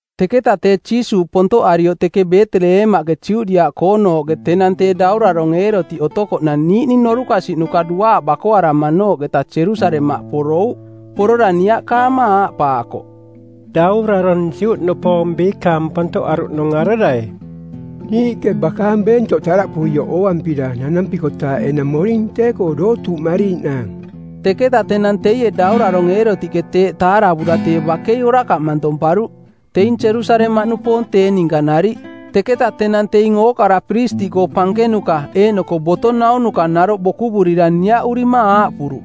Teketa tee Jiisuuꞌ pontoꞌarioꞌ teke Beeteleemaꞌke Judiaꞌkoonooꞌke tenang tee daurarong˜ Eerotiꞌ otokoꞌnang niiꞌning norukasiꞌnuka duaaꞌ bakoaramanooꞌketa Jerusalemaꞌ porouꞌ. Porora niaꞌkaama aaꞌpaakoꞌ, “Daurarong Juꞌnupoong biikaang pontoꞌaruꞌnung arerai? Niiꞌke bakaang beentoꞌ taꞌdaꞌpuioꞌ ooampira nanampikotaaꞌ enang moring tee-koo dootuuꞌmariiꞌnaang.” Teketa tenang teie daurarong Eerotiꞌke teeꞌ taaravura tee bakei orakaꞌ mantomparuꞌ, teing Jerusalemaꞌnupoong tee ninka nariꞌ. Teketa tenang teing ookara piristiꞌkoo pankenuka eeꞌnoko boto naunuka naroꞌ bokuvurira niaꞌurima aaꞌpuruꞌ,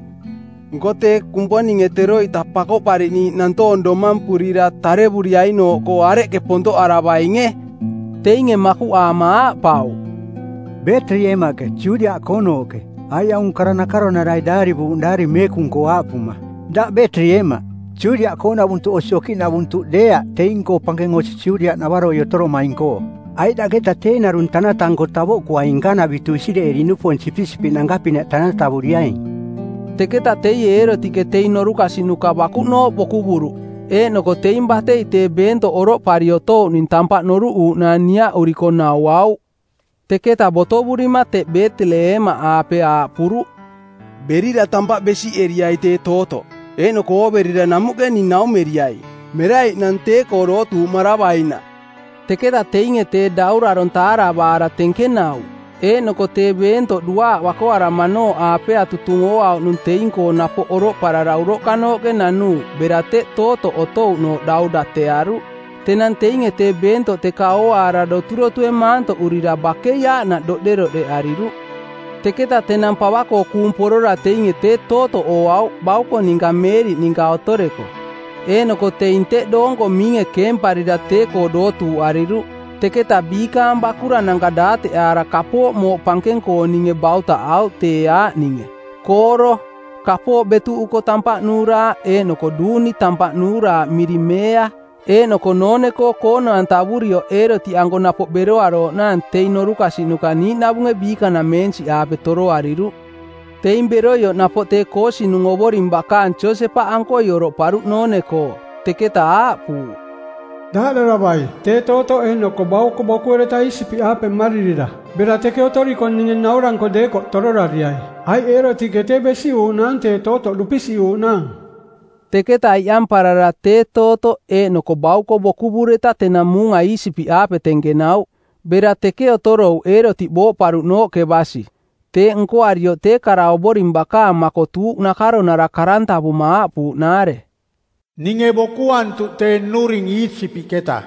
“Nko tee Kumponinge teroita Pakoꞌpariꞌniiꞌ nantoong domampurira tarevuriainooꞌkoo areꞌke pontoꞌaravainge?” Teinge makuꞌaama aaꞌpauꞌ, “Beeteleemaꞌke, Judiaꞌkoonooꞌke, aiꞌ aung kara nakaronarai daarivuuꞌnung Daari Meekung-koo, aaꞌpuma, ‘Daꞌ Beeteleemaꞌ, Judiaꞌkoonavuntuꞌ osi okiꞌnavuntuꞌ deeaꞌ teing-koo pankeng osi Judiaꞌnavaroi otoromaing-koo, aiꞌ daꞌketa tee narung tanata-nko tavoꞌkuaing nkanavitu Isireeli-nupoong sipisipiꞌnanka-pinaꞌ tanatavuriaing.’” Teketa teie Eerotiꞌke teing norukasiꞌnuka bakuꞌnooꞌ bokuvuruꞌ eeꞌnoko teing batei tee beentoꞌ oroꞌpari otouꞌning tampaꞌ noruꞌuuꞌnaang niaꞌuriko nauauꞌ. Teketa botovurima teꞌ Beeteleemaꞌaape aaꞌpuruꞌ, “Berira tampaꞌ besiꞌeriai tee tootoꞌ, eeꞌnoko ooverira namuꞌke ning naumeriai, meraiꞌnang tee-koo dootuuꞌmaravainaꞌ.” Teketa teinge tee daurarong taaravaara tenkenauꞌ, eeꞌnoko tee beentoꞌ duaaꞌ bakoaramanooꞌaapea tutung ooauꞌnung teing-koo napoꞌ oroꞌparara uroꞌkanooꞌke nanuuꞌ bera teꞌ tootoꞌ otouꞌnooꞌ dau datearuꞌ. Tenang teinge tee beentoꞌ teka ooaara doturotue maantoꞌurira bakei aaꞌnaꞌ doꞌderoꞌdeꞌariruꞌ. Teketa tenang pava-koo kuung porora teinge tee tootoꞌ ooauꞌ bauko ninka Meeriꞌ ninka otoreko. Eeꞌnoko teing teꞌ doonko miinge keemparira tee-koo dootuuꞌariruꞌ. Teketa biikaang bakurananka daateꞌaara kapooꞌ mooꞌ pankeng-kooninge bautaꞌauꞌ tee aaꞌninge: kooro, kapooꞌ betuꞌuko tampaꞌ nuuraaꞌ eeꞌnoko duuni tampaꞌ nuuraaꞌ miring meea. Eeꞌnoko noone-koo koono-antavurioꞌ Eerotiꞌanko napoꞌ beroarooꞌnaang teing norukasiꞌnuka niiꞌnavunge biikanameensiꞌaape toroariruꞌ. Teing beroioꞌ napoꞌ tee koosinung Ovoring bakaang Josepaꞌankoi oroꞌparuꞌ noone-koo, teketa aaꞌpuuꞌ, “Daaꞌdaravai. Tee tootoꞌ eeꞌnoko bauko bokuereta Iisipiꞌaape mmaririra bera teke otoriko ninge nauranko deekoꞌ tororariai, aiꞌ Eerotiꞌke tee besiꞌuuꞌnaang tee tootoꞌ dupisiꞌuuꞌnaang.” Teketa iꞌamparara tee tootoꞌ eeꞌnoko bauko bokuvureta tenang muunga Iisipiꞌaape tenkenauꞌ. Bera teke otorouꞌ Eerotiꞌ booꞌparuꞌnooꞌke basi. Teeꞌ nkoarioꞌ tee kara Ovoring bakaang makotuuꞌ nakaronara˜ karantavuma˜ aaꞌpuuꞌnaare: “Ninge bokuantuꞌ tee nnuring Iisipiꞌketa.”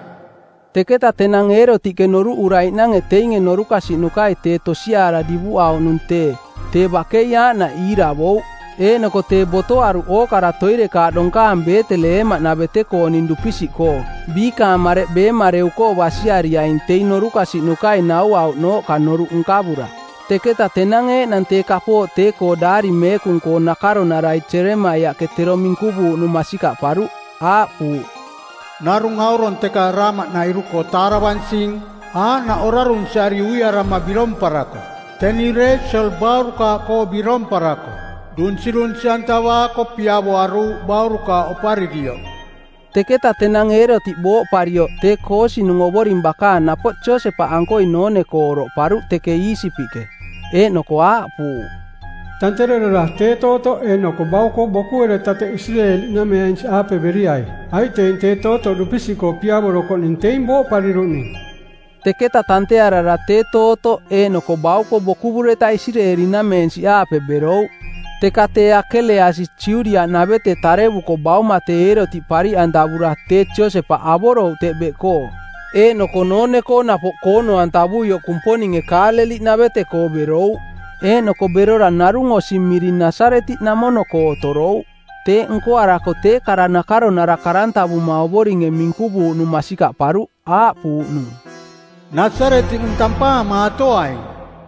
Teketa tenang Eerotiꞌke noruꞌuraiꞌnange teinge norukasiꞌnukai tee tosiaara divuꞌauꞌnung tee, tee bakei aaꞌnaꞌ iiravouꞌ eeꞌnoko tee botoaruꞌ ookara toirekaaꞌ donkaang Beeteleemaꞌnavete-kooning dupisiꞌkoo biikaang mareꞌ beemareu-koo basiariaing teing norukasiꞌnukai nauauꞌnooꞌka noruꞌ nkavura. Teketa tenang eeꞌnang tee kapooꞌ tee-koo Daari Meekung-koo nakaronarai Jeremaiaꞌke tero minkuvuuꞌnung masikaꞌparuꞌ. Aaꞌpuuꞌ, “Narung aurong teka Raama-nairu-koo taaravansing, aaꞌnaꞌ orarunsiari uiarama biromparako, teni Reesiel baurukaaꞌkoo biromparako, dunsirunsi-antavaako˜ piavoaruuꞌ baurukaaꞌ oparirioꞌ.” Teketa tenang Eerotiꞌ booꞌparioꞌ, tee koosinung Ovoring bakaang napoꞌ Josepaꞌankoi noone-koo oroꞌparuꞌ teke Iisipiꞌke. Eeꞌnoko aaꞌpuuꞌ, “Tanterarara tee tootoꞌ eeꞌnoko bauko bokuereta teꞌ Isireeli-nameensiꞌaape beriai, aiꞌ teing tee tootoꞌ dupisiꞌkoo piavorokoꞌning teing booꞌpariruꞌning.” Teketa tantearara tee tootoꞌ eeꞌnoko bauko bokuvureta Isireeli-nameensiꞌaape berouꞌ. Teka tee Akeleasi Judiaꞌnavete tarevuko bauma tee Eerotiꞌ pariꞌantavura tee Josepaꞌ avorouꞌ teꞌ beꞌkoo. Eeꞌnoko noone-koo napoꞌ koono-antavuioꞌ Kumponinge Kaaleliꞌnavete-koo berouꞌ. Eeꞌnoko berora narung osi miring Nasaretiꞌnamono-koo otorouꞌ. Teeꞌ nkoarako tee kara nakaronara karantavuma Ovoringe minkuvuuꞌnung masikaꞌparuꞌ, aaꞌpuuꞌnung, “Nasaretiꞌnung tampaamaatoaing.”